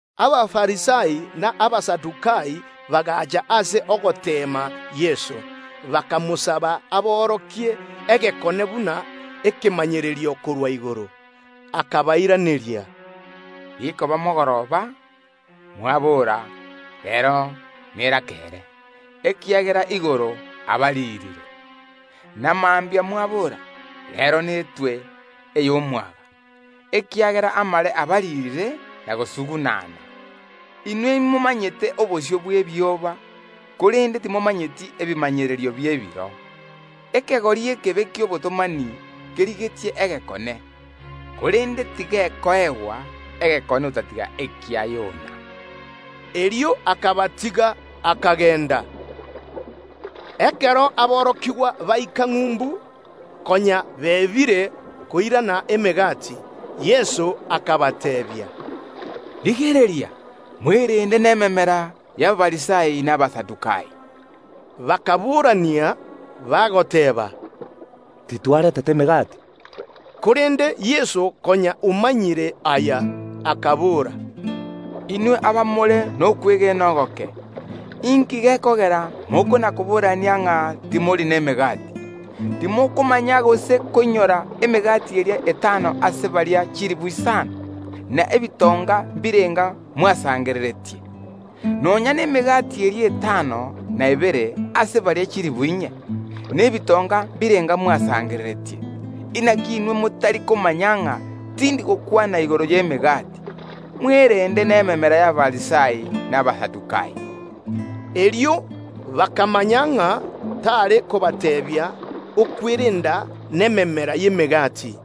Abafarisai na Abasadukai bagaacha ase ogoteema Yeso, bakamosaba aborokie egekone buna ekemanyererio korwa igoro. Akabairaneria, “Rikoba mogoroba, mwaboora: Reero nerakeere, ekiagera igoro abariirire. Na mambia mwaboora: Reero netwe ey’omwaga, ekiagera igoro yababariirire na gosung’unana. Inwe imomanyete korora obosio bwa igoro, korende timomanyeti ebimanyererio bi’ebiro. Ekegori egeturutumbu geteegeneti kerigetie egekone, korende tigekoegwa egekone otatiga ekia Yona.” Erio akabatiga, akagenda. Ekero aborokigwa baika ng’umbu, konya beebire koirana emegati. Yeso akabateebia, “Rigereria, mwerende nememera y’Abafarisai na Abasadukai.” Bakaboorania, bagoteeba, “Titwarentete emegati.” Korende Yeso, konya omanyire aya, akabora, “Inwe abamore nokwegena ogoke, inki gekogera mokona‐koborania ng’a timori nemegati? Timokomanya gose koinyora emegati eria etano ase baria chilifu isano, na ebitonga mbirenga mwasangereretie? Nonya nemegati eria etano n’ebere ase baria chilifu inye, na ebitonga mbirenga mwasangereretie? Inaki inwe motari komanya ng’a tindi gokwana igoro y’emegati? Mwerende nememera y’Abafarisai na Abasadukai.” Erio bakamanya ng’a tare kobateebia okwerenda nememera y’emegati,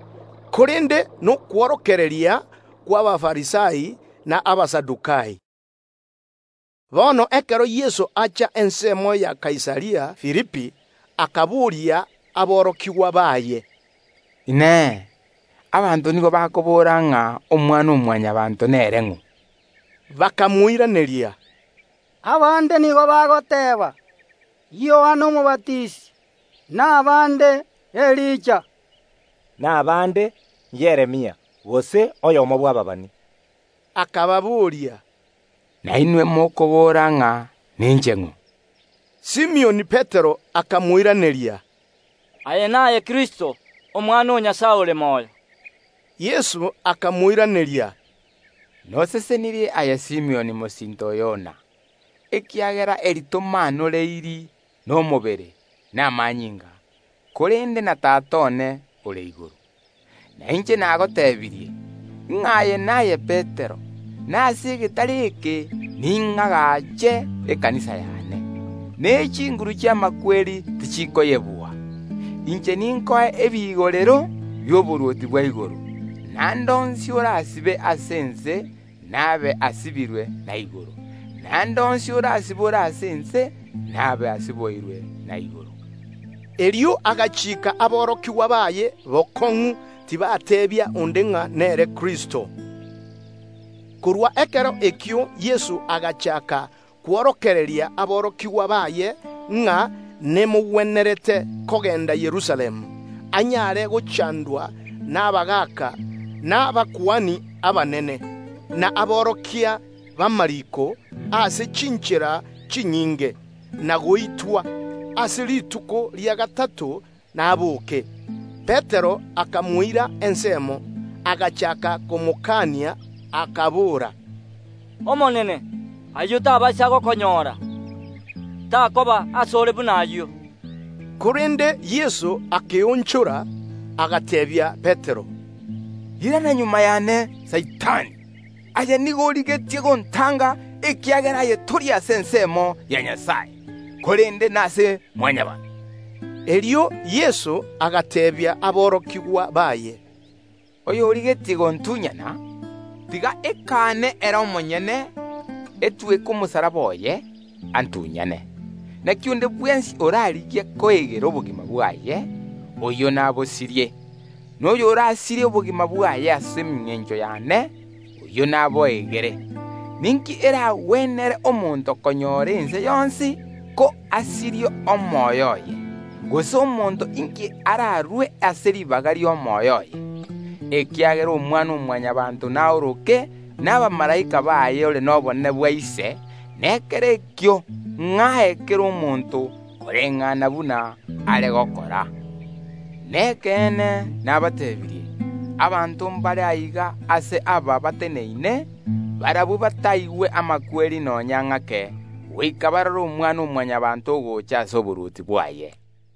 korende nokworokereria kw’Abafarisai na Abasadukai. Bono ekero Yeso acha ensemo ya Kaisaria Filipi, akaboria aborokigwa baye, “Inee! Abanto nigo bakobora ng’a Omwana-o-Mwanyabaanto nere ng’o?” Bakamoiraneria, “Abande nigo bagoteeba: Yohana Omobatisi; na abande: Elija; na abande: Yeremia gose oyomo bw’ababani.” Yeso akababoria, “Nainwe mokobora ng’a ninche ning’o?” Simioni Petero akamoiraneria, “Aye naye Kristo, Omwana o Nyasae ore moyo.” Yeso akamoiraneria, “Nosesenirie aye Simioni, mosinto o Yona, ekiagera eri tomaanoreiri nomobere na amanyinga, korende na Tata one ore igoro. Na inche nagotebirie, ng’a aye naye Petero, na igoro ase egetare eke ning’agache ekanisa y’ane, ne chinguru chi’amakweri tichikoyebua. Inche ninkoe ebigorero bi’oborwoti bwa igoro, na ande onsi orasibe ase ense nabe asibirwe na igoro, na ande onsi orasibore ase ense nabe asiboirwe na igoro.” Erio akabatianera bokong’u aborokigwa baye ng’a tibateebia onde nere Kristo. Korwa ekero ekio Yeso agachaaka kworokereria aborokigwa baye ng’a nemogwenerete kogenda Yerusalemu, agwo ase aranyare gochandwa mono ase amaboko y’abagaaka, na abakuani abanene, na aborokia b’amariiko, na goitwa; ase rituko ria gatato naboke. Petero akamoira ensemo, agachaaka komokania, akabora, “Omonene, ayio tabaisa gokonyora! Takoba ase ore buna ayio.” Korende Yeso akeonchora, agateebia Petero, “Irana magega y’ane, Saitani! Aye nigo origetie koba egetango ase inde, ekiagera ebirengererio biao tibiri ase ensemo ya Nyasae, korende nase Mwanyabaanto.” Erio Yeso agateebia aborokigwa baye, “monto onde bwensi origetie koba omotunyani one, tiga ekaane ere omonyene, etweke omosalaba oye, antunyane. Inaki onde bwensi orarigie koegerera obogima bwaye, oyio nabosirie; na oyorasirie obogima bwaye ase engencho y’ane, oyio naboegerere. Ninki eragwenere omonto konyora ense yonsi, ko asirie omoyo oye? Gose omonto inki ararue ase ribaga ri’omoyo oye? Ekiagera Omwana-o-Mwanyabaanto naoroke nabamalaika baye ore nobonene bwa Ise, na ekero ekio ng’ae kera omonto koreng’ana buna are gokora. Nekeene nabateebirie: Abanto mbare aiga ase aba bateneine, barabwo bataigwe amakweri nonya ng’ake goika barore Omwana-o-Mwanyabaanto ogocha ase oborwoti bwaye.”